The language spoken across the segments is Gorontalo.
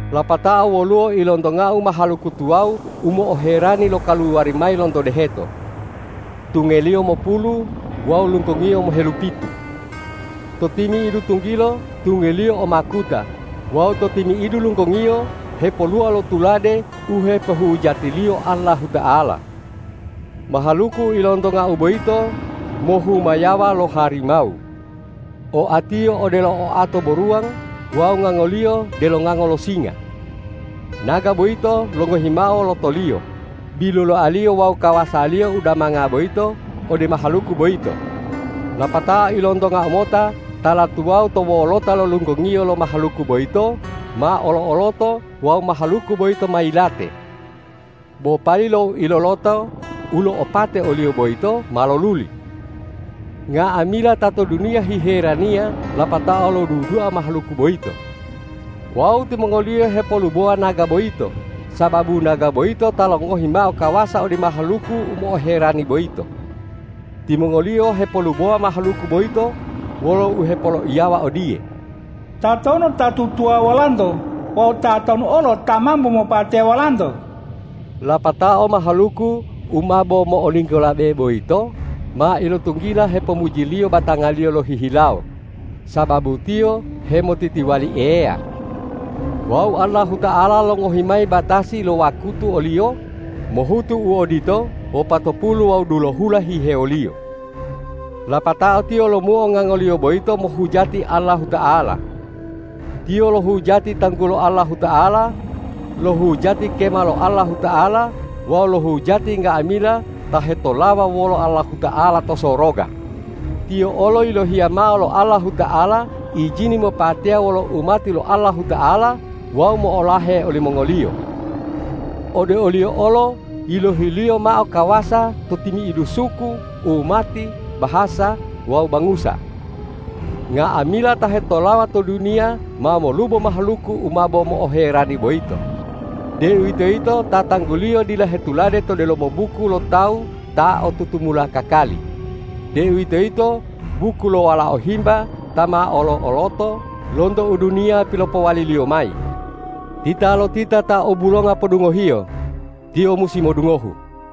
Lapatao woluwo ilontongau mahaluku tuwawu u mo'oherani lokaluwari mayi lonto deheto. Tungeliyo mopulu wawu lunggongiyo mohelupitu. To timi'idu tunggilo tungeliyo o makuta wawu to timi'idu lunggongiyo hepoluwa lo tulade u hepohujatiliyo Allahuta'ala. Mahaluku u ilontongau boyito mohumayawa lo harimawu. Oatiyo odelo oato boruwang wawu ngangoliyo delo ngango lo singa. Naga boyito longohi mao lotoliyo, biluloaliyo wawu kawasaliyo u damanga boyito ode mahaluku boyito. Lapatao ilontongau mota tala tuwawu to wolota lo lunggongiyo lo mahaluku boyito ma olo-oloto wawu mahaluku boyito ma yilate. Bo pali lo uiloloto u lo'opate oliyo boyito ma loluli. Nga'amila ta to duniya hiheraniya lapatao lodudua mahaluku boyito. Wawu timongoliyo hepolubowa naga boyito, sababu naga boyito ta longohi mao kawasa ode mahaluku u mo'oherani boyito. Timongoliyo hepolubowa mahaluku boyito wolo uhepoloiyawa odiye,”Tatonu ta tutuwawuwa wolanto wawu tatonu olo ta mambo mopateya wolanto?” Lapatao mahaluku u mabo mo'olinggolabe boyito ma ilotunggila hepomujiliyo batangaliyo lohihilawo, sababu tiyo hemotitiwali Eya. Wawu Allahuta'ala longohi mayi batasi lo wakutu oliyo mohutu u odito wopatopulu wawu dulohula hihewoliyo. Lapatao tiyo lomuo ngangoliyo boyito mohujati Allahuta'ala. Tiyo lohujati tanggulo Allahuta'ala, lohujati kema lo Allahuta'ala wawu lohujati nga'amila ta hetolawa wolo Allahuta'ala to soroga. Tiyo olo yilohiya mao lo Allahuta'ala ijini mopateya wolo umati lo Allahuta'ala wawu mo'olahe olimongoliyo. Ode oliyo olo yilohi-Liyo mao kawasa to timi'idu suku, umati, bahasa wawu bangusa. Nga'amila ta hetolawa to duniya ma molubo mahaluku u mabo mo'oherani boyito, deuwitoyito ta tangguliyo dila hetulade to delomo buku lo tawu ta o tutumula kakali, deuwitoyito buku lo Walao Himba ta ma olo-oloto lonto u duniya pilopowaliliyo lomayi. Titalotita ta o bulonga podungohiyo, tiyo musi modungohu.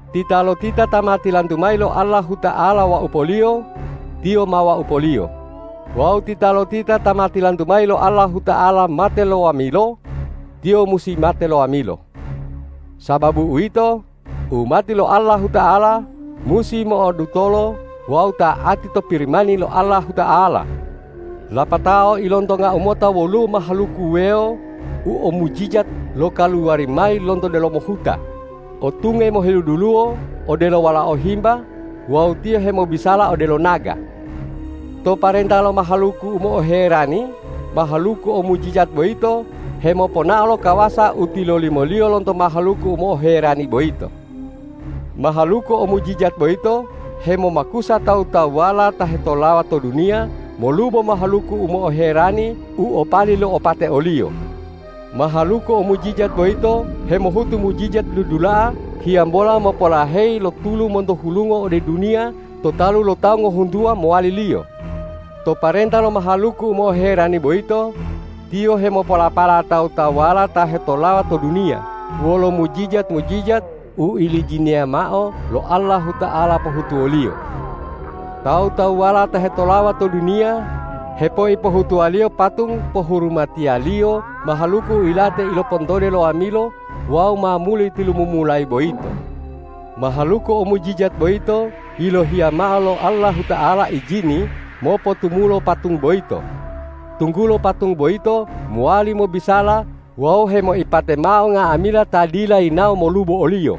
Titalotita ta ma tilantu mayi lo Allahuta'ala waupoliyo, tiyo ma waupoliyo; wawu titalotita ta ma tilantu mayi lo Allahuta'ala mate lo wamilo, tiyo musi mate lo wamilo. Sababu uwito, umati lo Allahuta'ala musi mo'odutolo wawu ta'ati to Pirimani lo Allahuta'ala. Lapatao ilontongau mota woluwo mahaluku wuwewo u o mujijat lokaluwari mayi lonto delomo huta, o tunge moheluduluwo odelo walao himba wawu tiyo hemobisala odelo naga. To parenta lo mahaluku u mo'oherani, mahaluku o mujijat boyito hemoponao lo kawasa u tilolimoliyo lonto mahaluku u mo'oherani boyito. Mahaluku o mujijat boyito hemomakusa tawu-tawuwala ta hetolawa to duniya molubo mahaluku u mo'oherani u o pali lo'opate oliyo. Mahaluku o mujijat boyito hemohutu mujijat dudula'a hiyambola mopolaheyi lo tulu monto hulungo ode duniya to talu lo tawu ngohuntuwa mowaliliyo. To parenta lo mahaluku u mo'oherani boyito, tiyo hemopolapala tawu-tawuwala ta hetolawa to duniya wolo mujijat-mujijat u ilijiniya mao lo Allahuta'ala pohutuwoliyo. Tawu-tawuwala ta hetolawa to duniya hepoipohutuwaliyo patung pohurumatiliyo mahaluku u yilate ilopontode lo wamilo wawu ma muli tilumumulayi boyito. Mahaluku o mujijat boyito yilohiya mao lo Allahuta'ala ijini mopotumulo patung boyito, tunggulo patung boyito mowali mobisala wawu hemoipate mao nga'amila ta dila yinawo molubo oliyo.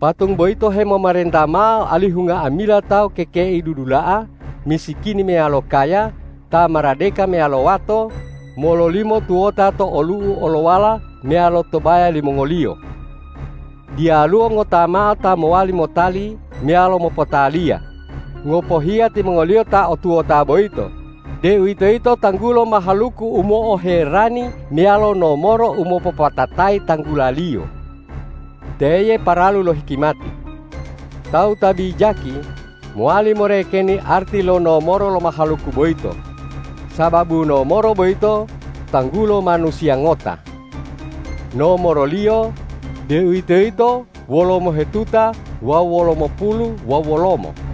Patung boyito hemomarenta mao alihu nga'amila tawu kekei dudula'a, misikini meyalo kaya, ta maradeka meyalo wato, mololimo tuwota to olu'u olowala meyalo to baya limongoliyo. Diyaluwo ngota mao ta mowali motali meyalo mopotaliya, ngopohiya timongoliyo ta o tuwota boyito, deuwitoyito tanggulo mahaluku u mo'oherani meyalo nomoro u mopopatatayi tanggulaliyo. Teye paralu lo hikimati. Tawu ta bijaki mowali morekeni arti lo nomoro lo mahaluku boyito, sababu nomoro boyito tanggulo manusiya ngota. Nomoroliyo, deuwitoyito wolomohetuta wawu wolomopulu wawu wolomo.